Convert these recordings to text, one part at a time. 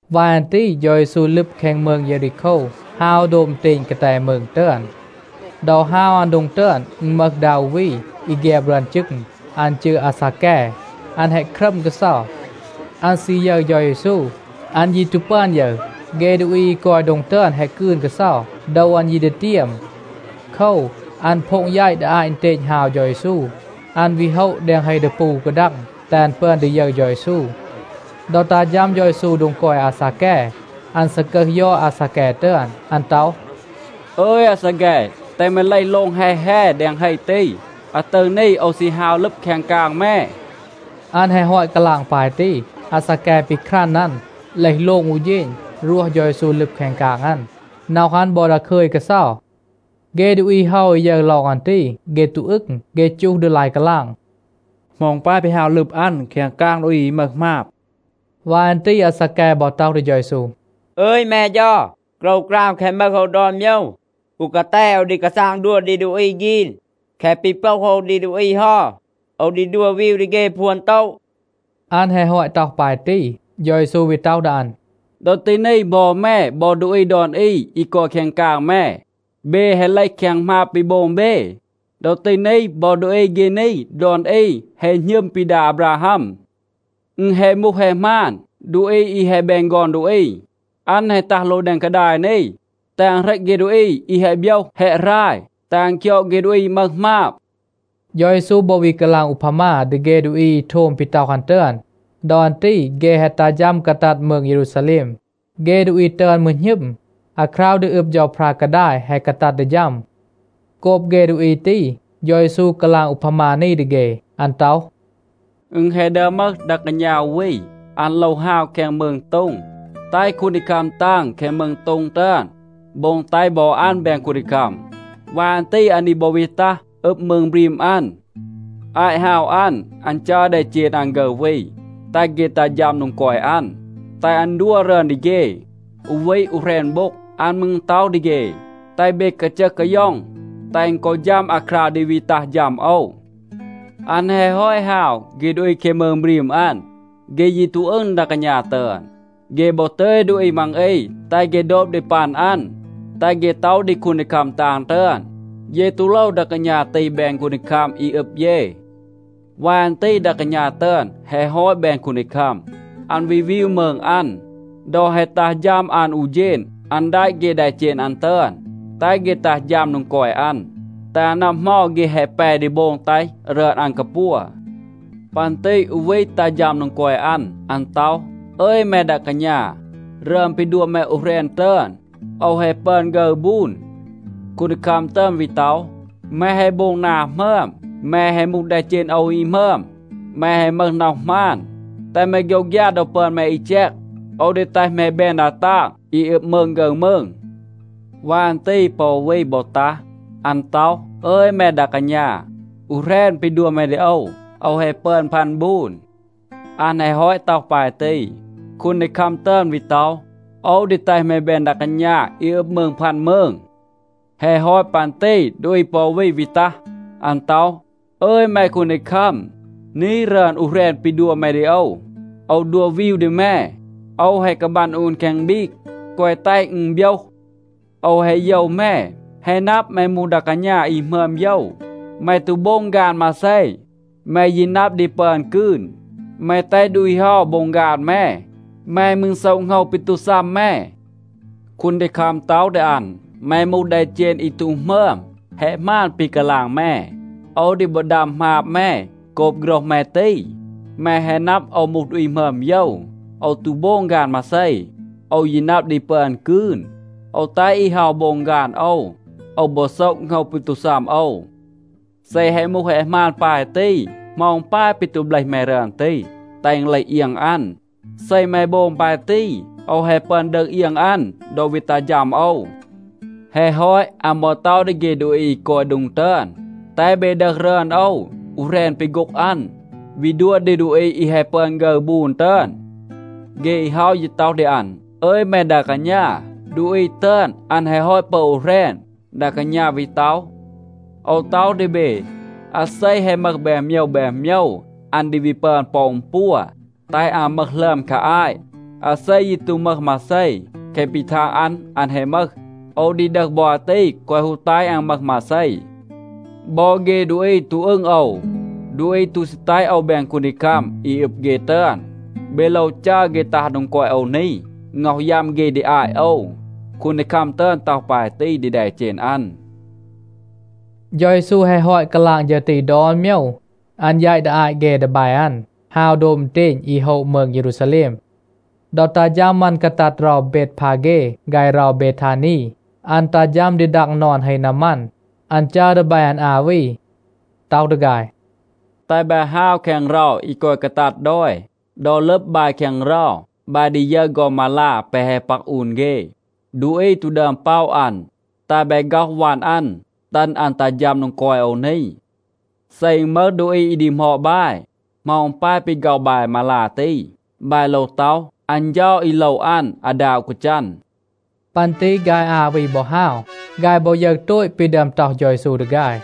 วาย อัน ตี เฌา เยซู ลึบ แคง มืง เยรีโคว, ฮาว โดบ อึณเตณ กาแต มืง ตึอน. ดอ ฮาว อัน โดง ตึอน, อึณ มึห ดา อู วี, อี แฆบ รึอน จึง. อัน จืร อาซาแก. อัน แฮะ ครัม กาเซา. อัน ซี ยึร เฌา เยซู. อัน ยี ตู ปึอน ยึร. เฆ ดูอี อี กอย โดง ตึอน แฮะ กืน กาเซา. โดว อัน ยี ดีเตียม. โคว, อัน โพ็ง แยต ดี อาต อึณเตณ ฮาว เฌา เยซู. อัน วี โฮะ แดง เฮ ดีปู อู กาดัง, แตห อัน ปึอน ดี ยึร เฌา เยซู. ดอ ตัห ฌัม เฌา เยซู โดง กอย อาซาแก, อัน ซากึห ยอด อาซาแก ตึอน. อัน ต็อห, “อึย อาซาแก, แตห แม เลห โลง แฮ แฮ แดง เฮ ตี. อาตึร นี โอว ซี ฮาว ลึบ แคง กาง แม.” อัน แฮะ ฮอต กาลาง ปาย ตี, อาซาแก ปีครัน อัน, เลห โลง อู เฌณ, รวห เฌา เยซู ลึบ แคง กาง อัน. น็อห อัน บอ ดาคึย กาเซา. เฆ ดูอี เฮา อี ยึร ลอง อัน ตี, เฆ ตู อึง. เฆ จูห ดี ลาย กาลาง, “เหมา อึณ ปาย ปี ฮาว ลึบ อัน แคง กาง ดูอี อี มึห หมาบ?” วาย อัน ตี อาซาแก บอ ต็อห ดี เฌา เยซู, “อึย แม เฌา, โกรวกราม แคะ มึห โอว ดอน โมยว, อู กาแต โอว ดี กาซาง ดัว ดี ดูอี ฆีน. แคะ ปี โปห โอว ดี ดูอี เฮา, โอว ดี ดัว วีว ดี เฆ พวน บูน.” อัน แฮะ ฮอต ต็อห ปาย ตี, เฌา เยซู วี ต็อห ดี อัน, “ดอ ตี นี บอ แม บอ ดูอี ดอน อี อี กอย แคง กาง แม, เบ แฮะ เลห แคง หมาบ ปี โบง เบ. ดอ ตี นี บอ ดูอี เฆ นี ดอน อี แฮะ หณึม ปี ดา อาบราฮัม. อึณ แฮะ มูห, แฮะ หมาน, ดูอี อี แฮะ แบน ฆอน ดูอี, อัน แฮะ ตัห โลง แดง กาดาย นี, แตห อัน เหรต เฆ ดูอี อี แฮะ โบยห, แฮะ หราย, แตห อัน คยอด เฆ ดูอี มึห หมาบ.” เฌา เยซู บอ วี กาลาง อูพามา ดี เฆ ดูอี อี โทม ปี ต็อห อัน ตึอน. ดอ อัน ตี เฆ แฮะ ตัห ฌัม กาตัด มืง เยรูซาแลม. เฆ ดูอี ตึอน มืร หณึม, อาคราว ดี อึบ เฌาพรา กาดาย แฮะ กาตัด ดี ฌัม. โกบ เฆ ดูอี ตี, เฌา เยซู กาลาง อูพามา นี ดี เฆ. อัน ต็อห, “อึณ แฮะ ดึอม มึห ดา กาณา อู วี. อัน โลว ฮาว แคง มืง โต็ง, แตห คูนดีคัม ตาง แคง มืง โต็ง ตึอน โบง แตห บอ อัน แบน คูนดีคัม. วาย อัน ตี อัน ดี บอ วี ตัห อึบ มืง บรีม อัน. อาต ฮาว อัน, อัน จัร แดเจณ อัน ฆึร วี แตห เฆ ตัห ฌัม โดง กอย อัน, แตห อัน ดัว รึอน ดี เฆ, อู วี อู แหรณ โบ็ง.a อัน มืร ต็อห ดี เฆ, ‘แตห เบ กาจึห กาย็อง, แตห อึณ กอ ฌัม อาคราว ดี วี ตัห ฌัม โอว.’ อัน แฮะ ฮอต ฮาว, เฆ ดูอี แคง มืง บรีม อัน, เฆ ยี ตู อึง ดา กาณา ตึอน. เฆ บอ ตึย ดูอี มัง อี, แตห เฆ โดบ ดี ปัน อัน, แตห เฆ ต็อห ดี คูนดีคัม ตาง ตึอน, ‘เย ตู โลว ดา กาณา ตี แบน คูนดีคัม อี อึบ เย.’ วาย อัน ตี ดา กาณา ตึอน แฮะ ฮอต แบน คูนดีคัม, อัน วี วีว มืง อัน. ดอ แฮะ ตัห ฌัม อัน อู เฌณ อัน แดะ เฆ แดเจณ อัน ตึอน, แตห เฆ ตัห ฌัม โดง กอย อัน, แตห อัน นับ เหมา เฆ แฮะ แป ดี โบง แตห รึอน อัน กาปัว. ปัน ตี อู วี ตัห ฌัม โดง กอย อัน. อัน ต็อห, ‘อึย แม ดา กาณา, รึอน ปี ดัว แม อู แหรณ ตึอน, โอว แฮะ ปึอน ฆึร บูน.’ คูนดีคัม ตึอน วี ต็อห, ‘แม แฮะ โบง นา หมึอม. แม แฮะ มูห แดเจณ โอว อี หมึอม. แม แฮะ มึห น็อห หมาน, แตห แม โฆยวฆยา ดอ ปึอน แม อี แจก. โอว ดี แตห แม แบน ดา ตาง อี อึบ มืง ฆึร มืง.’ วาย อัน ตี ปอ อู วี บอ ตัห. อัน ต็อห, ‘อึย แม ดา กาณา, อู แหรณ ปี ดัว แม ดี โอว, โอว แฮะ ปึอน พัน บูน.’ อัน แฮะ ฮอต ต็อห ปาย ตี, คูนดีคัม ตึอน วี ต็อห, ‘โอว ดี แตห แม แบน ดา กาณา อี อึบ มืง พัน มืง.’ แฮะ ฮอต ปัน ตี ดูอี ปอ อู วี วี ตัห. อัน ต็อห, ‘อึย แม คูนดีคัม, นี, รึอน อู แหรณ ปี ดัว แม ดี โอว, โอว ดัว วีว ดี แม. โอว แฮะ กาบัน อูน แคง บีก, แกวะ แตห อึณ โบยห. โอว แฮะ โยว แม. แฮะ นับ, แม มูห ดา กาณา อี หมึอม โยว. แม ตู โบง ฆาน มาเซ, แม ยี นับ ดี ปึอน กืน, แม แตห ดูอี เฮา โบง ฆาน แม. แม มืร โซะ โหงว ปี ตู ซัม แม.’ คูนดีคัม ต็อห ดี อัน, ‘แม มูห แดเจณ อี ตู หมึอม. แฮะ หมาน ปี กาลาง แม. โอว ดี บอ ดัม หมาบ แม โกบ โฆรห แม ตี. แม แฮะ นับ, โอว มูห ดูอี หมึอม โยว. โอว ตู โบง ฆาน มาเซ. โอว ยี นับ ดี ปึอน กืน. โอว แตห อี เฮา โบง ฆาน โอว. โอว บอ โซะ โหงว ปี ตู ซัม โอว. เซ แฮะ มูห แฮะ หมาน ปาย ตี, เหมา อึณ ปาย ปี ตู เบลห แม รึอน ตี, แตห อึณ เลห เอียง อัน? เซ แม โบง ปาย ตี, โอว แฮะ ปึอน ดึห เอียง อัน ดอ วี ตัห ฌัม โอว.’ แฮะ ฮอต, อัน บอ ต็อห ดี เฆ ดูอี อี กอย โดง ตึอน, ‘แตห เบ ดึห รึอน โอว อู แหรณ ปี โฆ็ง อัน, วี ดัว ดี ดูอี อี แฮะ ปึอน ฆึร บูน ตึอน.’ เฆ อี เฮา ยี ต็อห ดี อัน, ‘อึย แม ดา กาณา, ดูอี ตึอน, อัน แฮะ ฮอต ปึอน อู แหรณ.’ ดา กาณา วี ต็อห, ‘โอว ต็อห ดี เบ, อาเซ แฮะ มึห แบน โมยว แบน โมยว, อัน ดี วี ปึอน ปอ อึณ ปัว, แตห อัน มึห หลึอม คา อาต. อาเซ ยี ตู มึห มาเซ, แคะ ปี ทาง อัน, อัน แฮะ มึห, โอว ดี ดึห บอ อาตี, แกวะ ฮู แตห อัน มึห มาเซ.’ บอ เฆ ดูอี ตู อึง โอว, ดูอี ตู ซี แตห โอว แบน คูนดีคัม อี อึบ เฆ ตึอน, เบ โลว จัร เฆ ตัห โดง กอย โอว นี, ง็อห ยัม เฆ ดี อาต โอว. คูนดีคัม ตึอน ต็อห ปาย ตี ดี แดเจณ อัน.” เฌา เยซู แฮะ ฮอต กาลาง ฌึร ตี ดอน โมยว, อัน แยต ดี อาต เฆ ดีแบ อัน, ฮาว โดบ อึณเตณ อี โฮะ มืง เยรูซาแลม. ดอ ตัห ฌัม อัน กาตัด เรา เบดพาเฆ ฆาย เรา เบทานี, อัน ตัห ฌัม ดี ดัง นอน เฮ นามัน. อัน จัร ดีแบ อัน อา วี, ต็อห ดี ฆาย, “แตห บาย ฮาว แคง เรา อี กอย กาตัด ดอย. ดอ ลึบ บาย แคง เรา, บาย ดี ยึร ฆอน มาลา แปะ แฮะ ปัก อูน เฆ. ดูอี ตู ดึอม ป็อะ อัน. แตห บาย ฆ็อห วัน อัน, ตึณ อัน ตัห ฌัม โดง กอย โอว นี. เซ อึณ มึห ดูอี อี ดีหมอด บาย, เหมา อึณ ปาย ปี ฆ็อห บาย มาลา ตี, บาย โลว ต็อห, ‘อัน เฌา อี โลว อัน อาดา อู กาจัน.’” ปัน ตี ฆาย อา วี บอ ฮาว. ฆาย บอ ยึร โตต ปี ดึอม ต็อห เฌา เยซู ดี ฆาย.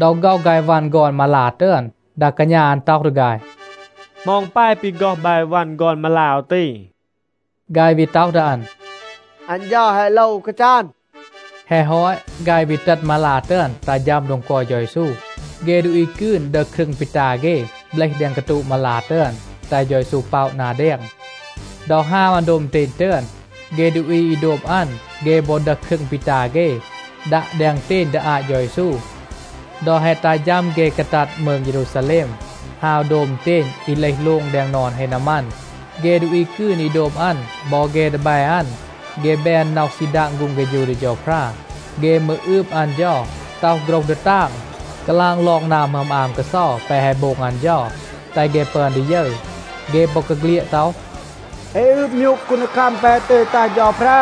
ดอ ฆ็อห ฆาย วัน ฆอน มาลา ตึอน, ดา กาณา อัน ต็อห ดี ฆาย, “เหมา อึณ ปาย ปี ฆ็อห บาย วัน ฆอน มาลา โอว ตี?” ฆาย วี ต็อห ดี อัน, “อัน เฌา แฮะ โลว อู กาจัน.” แฮะ ฮอต, ฆาย วี ตึณ มาลา ตึอน ตัห ฌัม โดง กอย เฌา เยซู. เฆ ดูอี กืน ดึห ครึง ปี ตา เฆ, เบลห แดง กาตูะ มาลา ตึอน, แตห เฌา เยซู ป็อะ นา แดง. ดอ ฮาว อัน โดบ อึณเตณ ตึอน, เฆ ดูอี อี โดบ อัน, เฆ บอ ดึห ครึง ปี ตา เฆ, ดัะ แดง อึณเตณ ดี อาต เฌา เยซู. ดอ แฮะ ตัห ฌัม เฆ กาตัด มืง เยรูซาแลม, ฮาว โดบ อึณเตณ อี เลห โลง แดง นอน เฮ นามัน, เฆ ดูอี กืน อี โดบ อัน บอ เฆ ดีแบ อัน, เฆ แบน น็อห ซี ดาง ฆูง เฆฌู ดี เฌาพรา. เฆ มืร อืบ อัน เฌา, ต็อห โฆรห ดีตาง, กาลาง ลอง นา หมึอม อาม กาเซา แปะ แฮะ โบง อัน เฌา, แตห เฆ ปึอน ดี ยึร. เฆ บอกาเฆลียด ต็อห, “เอ อืบ มยูก คูนดีคัม แปะ แฮะ ตึย ตัห เฌาพรา.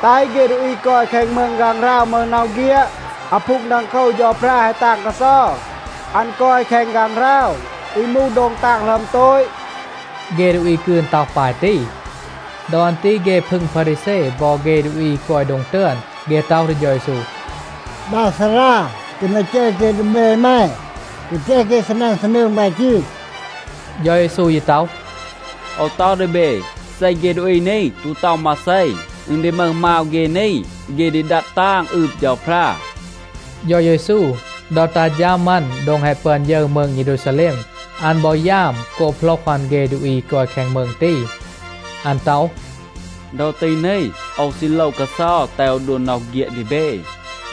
แตห เฆ ดูอี กอย แคง มืง ฆางหราว มึห น็อห เฆียด. อาพูง ดังโคว เฌาพรา แฮะ ตาง กาเซา. อัน กอย แคง ฆางหราว, อี มูห โดง ตาง หลึอม โตต.” เฆ ดูอี กืน ต็อห ปาย ตี. ดอ อัน ตี เฆ พึง พารีแซ บอ เฆ ดูอี อี กอย โดง ตึอน, เฆ ต็อห ดี เฌา เยซู, “ดา ซารา, แตห แม จัร เฆ ดีแบ แม, แกวะ แตห เฆ ซีนัน ซีนืง ปาย ตี.” เฌา เยซู ยี ต็อห, “โอว ต็อห ดี เบ, เซ เฆ ดูอี นี ตู ต็อห มาเซ, อึณ ดี มึห มาว เฆ นี, เฆ ดี ดัด ตาง, อืบ เฌาพรา.” เฌา เยซู, ดอ ตัห ฌัม อัน โดง แฮะ ปึอน ยึร มืง เยรูซาแลม, อัน บอ ยาม โกบ โหลห อัน เฆ ดูอี อี กอย แคง มืง ตี. อัน ต็อห, “ดอ ตี นี, โอว ซี โลว กาเซา, แตห โอว ดัว น็อห เฆียด ดี เบ.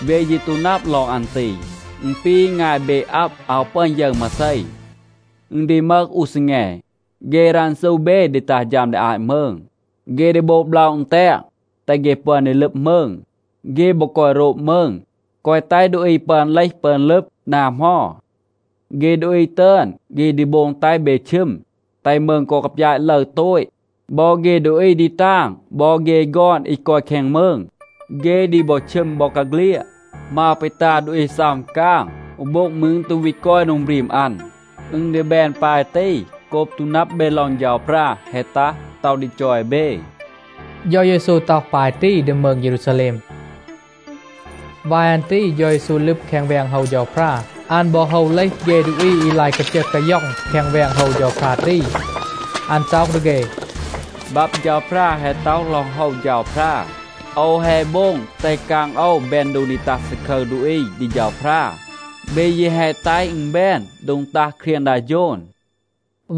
เบ ยี ตู นับ ลอง อัน ตี. อึณ ปี งาย เบ อับ, อาว ปึอน ยึร มาเซ. อึณ ดี มึห อู ซีแง, เฆ รันซู เบ ดี ตัห ฌัม ดี อาต มืง. เฆ ดี โบง บล็อะ อึณแตง, แตห เฆ ปึอน ดี ลึบ มืง. เฆ บอ กอย โรบ มืง, แกวะ แตห ดูอี ปึอน เลห ปึอน ลึบ นา เหมา. เฆ ดูอี ตึอน, เฆ ดี โบง แตห เบ ชึม, แตห มืง กอ กาปยาต ลึร โตต. บอ เฆ ดูอี ดีตาง บอ เฆ ฆอน อี กอย แคง มืง, เฆ ดี บอ ชึม บอกาเฆลียด. มาว ปี ตา ดูอี ซัม กาง, อู โบ็ง มืร ตู วี กอย โดง บรีม อัน. อึณ ดี แบน ปาย ตี, โกบ ตู นับ เบ ลอง เฌาพรา แฮะ ตัห, ต็อห ดี จอย เบ.” เฌา เยซู ต็อห ปาย ตี ดี มืง เยรูซาแลม. วาย อัน ตี เฌา เยซู ลึบ แคง แวง โฮว เฌาพรา. อัน บอ โฮว เลห เฆ ดูอี อี ลาย กาจึห กาย็อง แคง แวง โฮว เฌาพรา ตี. อัน ต็อห ดี เฆ, “บับ เฌาพรา แฮะ ต็อห ลอง โฮว เฌาพรา, ‘โอว แฮะ โบง แตห กาง โอว แบน โดง ดี ตัห ซาคึร ดูอี ดี เฌาพรา.’ เบ ยี แฮะ แตห อึณ แบน โดง ตัห เครียง ดา โฌน.”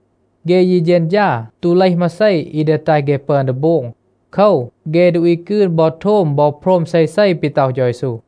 เฆ ยี เฌณฌา ตู เลห มาเซ อี ดี แตห เฆ ปึอน ดี โบง. โคว, เฆ ดูอี กืน บอ โทม บอ โพรม เซเซ ปี ต็อห เฌา เยซู.